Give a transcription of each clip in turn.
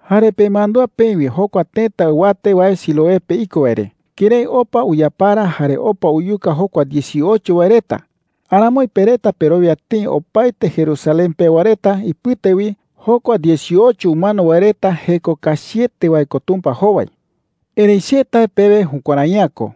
“Jare pemandúa peï wi jokua tëta ɨwate wae Siloé pe iko wae re, kërái opa uyapara jare opa uyuka jokua dieciocho wae reta. Aramoi pe reta perowia tëi opaete Jerusalén pewa reta ipɨte wi, jokua dieciocho umano wae reta jeko kachiete wae ko Tumpa jowai,” jei. “Erëi che tae pewe, jukuärai’ä ko.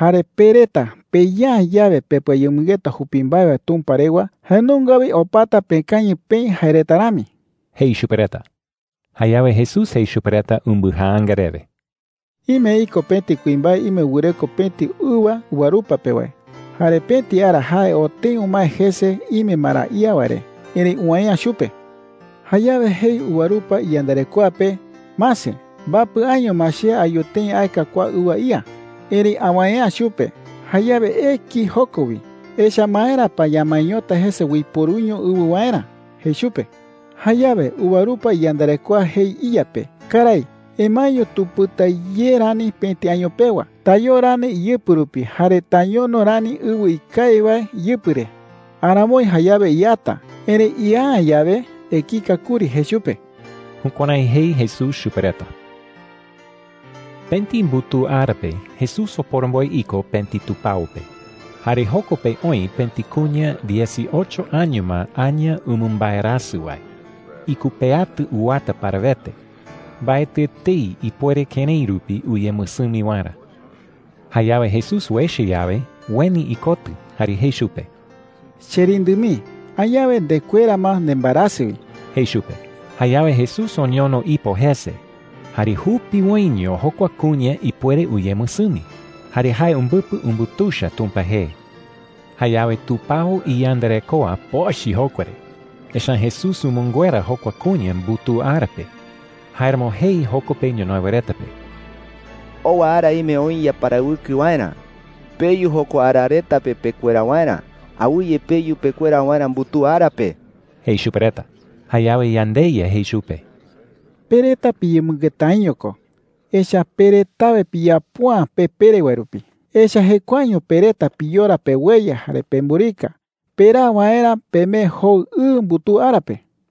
Jare pe reta peya’ä yawe pepɨayemɨngeta jupi mbae wae Tumpa rewa, jae nunga wi opata pekañɨ peï jae reta rami,” jei chupe reta. Jayawe Jesús jei chupe reta umbɨjaanga rewe: “Ime iko pëti kuimbae ime wɨreko pëti ɨwa Ɨwa ko jee “higo” karái ñee pe. uvarupa pe wae. Jare pëti ara jae oo tëi umae jese ime ma ra ía wae re. Erëi uwäe’ä chupe,” jei. “Jayawe jei uvarupa iyandarekoa pe: ‘Mase, mbapɨ año ma che ayu tëi aeka kua ɨwa ía, erëi awäe’ä chupe. Jayawe eki joko wi. Echa’ä ¿maera pa ñamaeñota jese uiporuiño ɨwɨ waerä?’ jei chupe. “Jayawe uvarupa iyandarekoa jei iya pe: ‘Karái, emaeño tupɨta ye rani pëti año pewa. Tayoo rani iyɨpɨ rupi jare tañono rani ɨwɨ ikawi wae iyɨpɨ re. Aramoi jayawe iata. Erëi ia’ä yawe, ekika kuri,’ jei chupe.” Jukuärái jei Jesús chupe reta. Pëti mbutuu ara pe Jesús oporomboe iko pëti tupao pe. Jare joko pe oï pëti kuña dieciocho año ma aña umɨmbaerasɨ wae. Ikupeatɨ uwata parawete. Mbaetɨ etei ipuere kërái rupi uyemɨsɨmi waerä. Jayawe Jesús uecha yawe, ueni ikotɨ jare jei chupe: “Cherindɨ mii, añawe ndekuera ma nembaerasɨ wi,” jei chupe. Jayawe Jesús oñono ipo jese. Jare jupiwoiño jokua kuña ipuere uyemɨsɨmi, jare jae umbɨpɨ umbutuicha Tumpa jee. Jayawe tupao iyandarekoa pochɨ jokua re. Echa’ä Jesús umɨnguera jokua kuña mbutuu ara pe. Jáeramo jei joko pe ñonoï wae reta pe: “Owa ara ime oï yaparawɨkɨ waerä. Peyu jokua ara reta pe pekuera waerä. Awɨye peyu pekuera waerä mbutuu ara pe,” jei chupe reta. Jayawe yandeYa jei chupe: “Pe reta piyemɨngetaiño ko, echa’ä pe retawe piyapo’ä pe pere wae rupi. Echa’ä jekuaeño pe reta piyora peweye jare pemburika peraa waerä pemee jou ɨ mbutuu ara pe.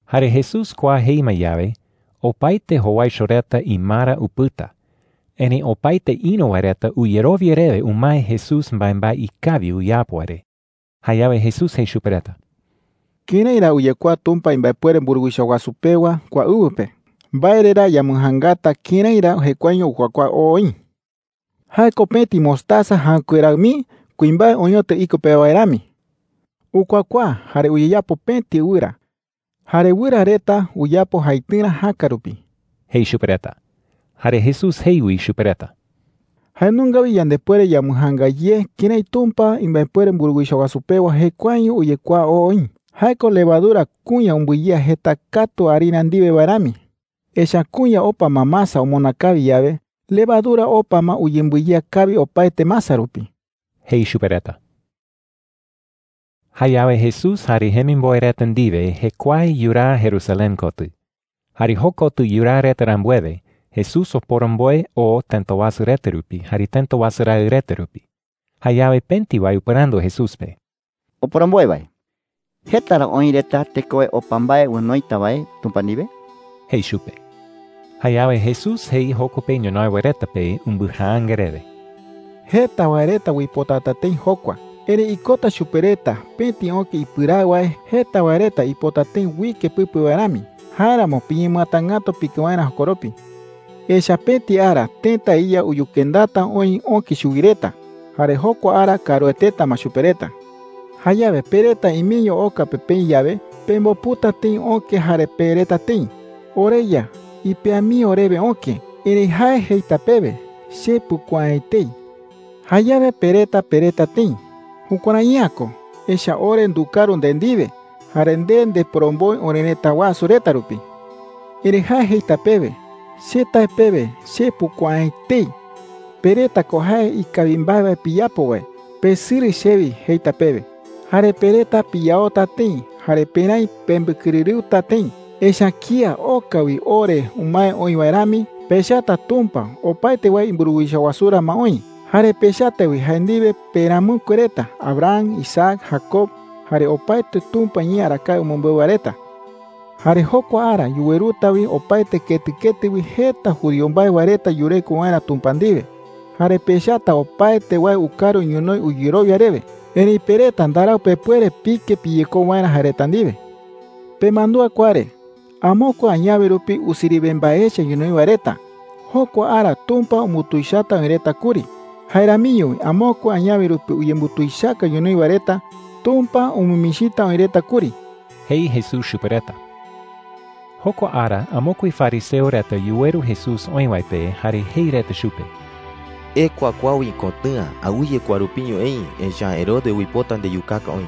Jare Jesús kua jei ma yawe, opaete jowaicho reta imara upɨta. Erëi opaete ïru wae reta uyerowia rewe umae Jesús mbaembae ikawi uyapo wae re. Jayawe Jesús jei chupe reta: “¿Kërái ra uyekuaa Tumpa imbaepuere mburuwicha wasu pewa kua ɨwɨ pe? ¿Mbae re ra yambɨjaangata kërái ra jekuaeño ukuakuaa oo oï?” jei. “Jae ko pëti mostaza jäɨkue raɨ mii kuimbae oñotɨ iko pe wae rami,” jei. “Ukuakuaa jare uyeyapo pëti ɨwɨra. Jare wɨra reta uyapo jaitɨrä jäka rupi,” jei chupe reta. Jare Jesús jei wi chupe reta: “Jae nunga wi yandepuere yambɨjaanga ye kërái Tumpa imbaepuere mburuwicha wasu pewa jekuaeño uyekuaa oo oï. Jae ko levadura kuña umbɨyea jeta katu harina ndiwe wae rami,” jei. “Echa’ä kuña opa ma masa omona kawi yawe, levadura opa ma uyembɨyea kawi opaete masa rupi,” jei chupe reta. Jayawe Jesús jare jemimboe reta ndiwe jekuae yuraa Jerusalén kotɨ. Jare jokotɨ yuraa reta rambuewe, Jesús oporomboe oo tëta wasu reta rupi jare tëta wasu raɨ reta rupi. Jayawe pëti wae upɨrandu Jesús pe: “Oporomboe wae, ¿jeta ra oï reta tekowe opa mbae onoita wae Tumpa ndiwe?” jei chupe. Jayawe Jesús jei joko pe ñonoï wae reta pe umbɨjaanga rewe: “Jeta wae reta uipotata tëi jokua. Erëi ikota chupe reta pëti öke ipɨraɨ wae jeta wae reta uipota tëi uike pɨpe wae rami. Jáeramo piñemɨatangätu pike waerä jokoropi,” jei. “Echa’ä pëti ara tëta iya uyukendata oï öke chuwi reta. Jare jokua ara kaarueteta ma chupe reta,” jei. “Jayawe pe reta imeño oka pe peï yawe, pemboputa tëi öke jare pereta tëi: ‘OreYa, ipea mii orewe öke.’ “Erëi jae jeita pewe: ‘Che pukuaa’ä etei.’ “Jayawe pe reta pereta tëi: ‘Jukuärai’ä ko, echa’ä ore ndukaru nde ndiwe, jare nde ndeporomboe orerëta wasu reta rupi.’ “Erëi jae jeita pewe: ‘Che tae pewe, che pukuaa’ä etei. Pe reta ko jae ikawi mbae wae piyapo wae. Pesɨrɨ chewi,’ jeita pewe. “Jare pe reta piyaota tëi jare peräi pembɨkɨrɨrɨuta tëi. Echa’ä kía oka wi o re umae oï wae rami, pechata Tumpa opaete wae imburuwicha wasurä ma oï. Jare pechata wi jae ndiwe peramɨkue reta Abraham, Isaac, Jacob, jare opaete Tumpa iñee arakae umɨmbeu wae reta,” jei. “Jare jokua ara yuweruta wi opaete ketɨ ketɨ wi jeta judío mbae wae reta yureko waerä Tumpa ndiwe. Jare pechata opaete wae ukaru ñonoï uyerowia rewe. Erëi pe reta ndarau pepuere pike piyekou waerä jae reta ndiwe,” jei chupe reta. “Pemandúa kua re: Amokue añawe rupi usiriwe mbae echa ñonoï wae reta, jokua ara Tumpa umbutuichata oï reta kuri. Jae ramiño wi amokue añawe rupi uyembutuichaka ñonoï wae reta, Tumpa umɨmichita oï reta kuri,” jei Jesús chupe reta. Jokua ara amokue fariseo reta yuweru Jesús oï wae pe jare jei reta chupe: “Ekua kua wi ikotɨ̈a. Awɨye kua rupiño eï. Echa’ä Herodes uipota ndeyukaka oï,”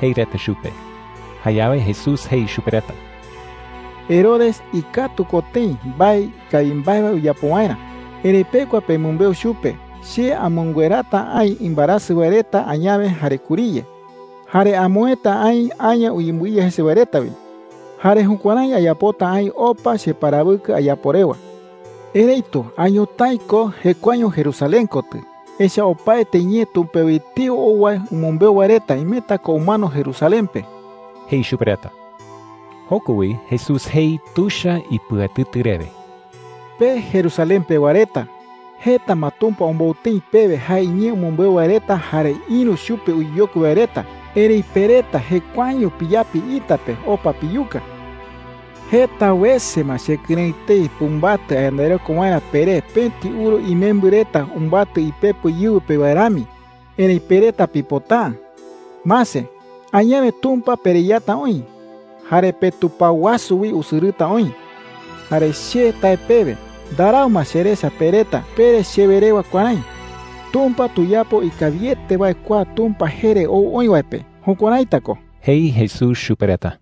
jei reta chupe. Jayawe Jesús jei chupe reta: “Herodes ikatu ko tëi mbae ikawi mbae wae uyapo waerä. Erëi pekua pemɨmbeu chupe che amɨnguerata aï imbaerasɨ wae reta añawe jare kuriye. Jare amoëta aï aña uyembɨiya jese wae reta wi. Jare jukuärái ayapota aï opa cheparawɨkɨ ayapo rewa,” jei. “Erëitu a ñotái ko jekuaeño Jerusalén kotɨ. Echa’ä opaete ñee Tumpa wi etei ou wae umɨmbeu wae reta imeta ko umano Jerusalén pe,” jei chupe reta. Joko wi Jesús jei tuicha ipɨatɨtɨ rewe: “Pe Jerusalén pewa reta, jeta ma Tumpa ombou tëi pewe jae iñee umɨmbeu wae reta jare ïru chupe uyeyokui wae reta. Erëi pe reta jekuaeño piyapi ita pe opa piyuka,” jei. “Jeta wese ma chekɨrëɨ tëi pumbatɨ ayandareko waerä peré, pëti uru imembɨ reta umbatɨ ipepo íɨwɨ pe wae rami, erëi pe reta pipota’ä,” jei. “Mase, añawe Tumpa pereyata oï, jare petupao wasu wi usɨrɨta oï. Jare che tae pewe, ndarau ma cherecha pe reta pere chewe rewa kuärái: ‘Tumpa tuyapo ikawiete wae kua Tumpa jee re ou oï wae pe.’ Jukuäraita ko,” jei Jesús chupe reta.